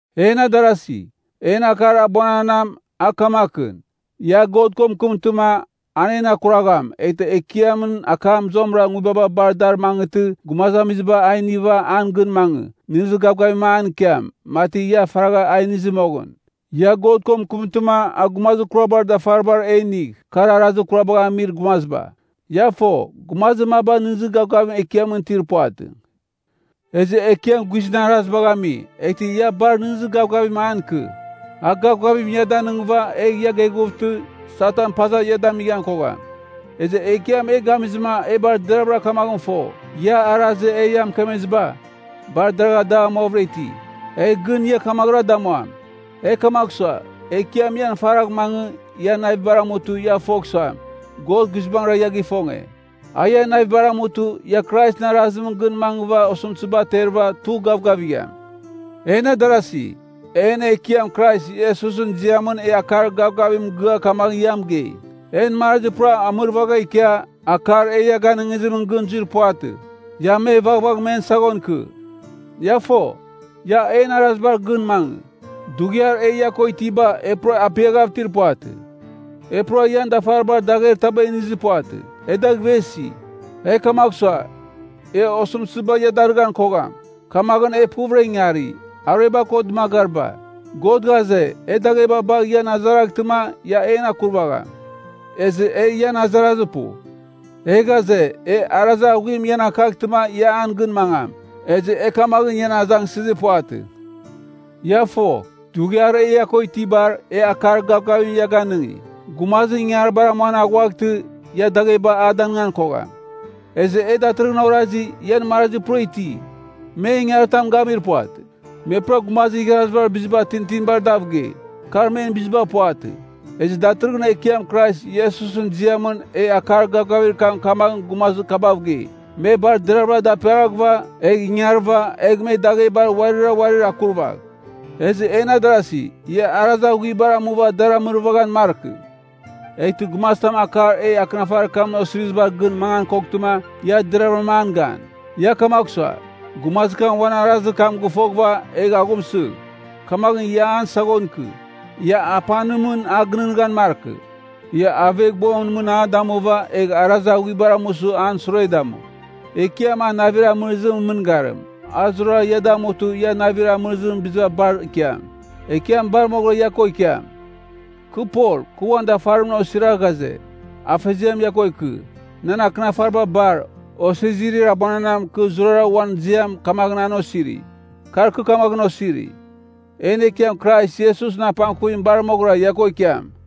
En adarasi, en akar abuananam, a kamakɨn. Ia God ko mɨkɨmtɨma, an en akuragham, eghtɨ Ekiamɨn akam zuamɨra nguibaba bar a dar mangɨtɨ gumazamiziba a iniva an gɨn mangɨ, nɨghnɨzir gavgavim an ikiam, mati ia faragha a inizɨ moghɨn. Ia God ko mɨkɨmtɨma a gumazir kurabar dafaribar e inigh, kar arazir kurabagh amir gumaziba. Ia fo, gumazir maba nɨghnɨzir gavgavim Ekiamɨn itir puvatɨ. Ezɨ Ekiam guizɨn arazibagh ami, eghtɨ ia bar nɨghnɨzir gavgavimra an ikɨ. A gavgavim ia danɨngɨva, egh ia geghuvtɨ, Satan paza ia damighan kogham. Ezɨ Ekiam e gamizɨma e bar deravɨra kamaghɨn fo, ia arazir e ia mɨkemeziba, bar dagh amuavɨra iti. Egh gɨn ia kamaghɨra damuam. E kamagh sua, Ekiam ian faragh mangɨ, ian navibar amutɨ, ia fogh suam, God guizbangɨra ia gifonge. A ian navibar amutɨ, ia Kraisɨn arazimɨn gɨn mangɨva osɨmtɨziba aterɨva tugh gavgavigham. En adarasi, en Ekiam Krais Iesusɨn ziamɨn e akar gavgavim mɨgɨa kamaghɨn ia mɨgei, en marazi pura amɨrvagha ikia, akar e ia ganɨngizimɨn gɨn zuir puvatɨ. Ia me vaghvagh men saghon ikɨ. Ia fo, ia en arazibar gɨn mangɨ. Dughiar e ia ko itiba, e pura apiaghav itir puvatɨ. E pura ian dafaribar dagher taba inizir puvatɨ. E dagh ivesi. E kamagh sua, e osɨmtɨziba ia darɨghan kogham. Kamaghɨn e puvɨra ingari, arueba ko dɨmagariba. God ghaze, e dagheba bagh ian azaraghtɨma, ia en akurvagham. Ezɨ e ian azarazir pu. E ghaze, e arazir aghuim ian akaghtɨma ia an gɨn mangam. Ezɨ e kamaghɨn ian azangsɨzir puvatɨ. Ia fo, dughiar e ia ko itibar, e akar gavgavim ia ganɨngi: gumazim ingangaribar amuan aghuaghtɨ, ia dagheba a danɨngan kogham. Ezɨ e datɨrɨghɨn orazi, ian marazi pura iti. Me ingangaritam gamir puvatɨ. Me pura gumazir igharazibar biziba tintinibar dav gei. Kar men biziba puvatɨ. Ezɨ datɨrɨghɨn Ekiam Krais Iesusɨn ziamɨn e akar gavgavir kam kamaghɨn gumazir kabav gei, me bar deravɨra daperaghɨva, egh ingarɨva, egh me daghebar uarira uarir akurvagh. Ezɨ en adarasi, ia arazir aghuibar amuva dar amɨrvaghan markɨ. Eghtɨ gumazitam akar e akɨnafarir kamɨn osirizibar gɨn mangan koghtɨma, ia deravɨram an gan. Ia kamagh sua, gumazir kam uan arazir kam gɨfoghɨva egh aghumsɨgh, kamaghɨn ia an saghon ikɨ. Ia apanimɨn a gɨnɨghnɨghan markɨ, ia aveghbuamɨn mɨn a damuva, egh arazir aghuibar amusɨ an sure damu. Ekiam a navir amɨrɨzimɨn mɨngarim, a zurara ia damutɨ ia navir amɨrɨzimɨn biziba bar ikiam. Ekiam bar moghɨra ia ko ikiam. Kɨ Pol, kɨ uan dafarimɨn osira ghaze, Afeziam ia ko ikɨ. Nan akɨnafariba bar, osizirir abuananam kɨ zurara uan ziam kamaghɨn an osiri. Kar kɨ kamaghɨn osiri. En Ekiam Krais Iesusɨn apangkuvim bar moghɨra ia ko ikiam.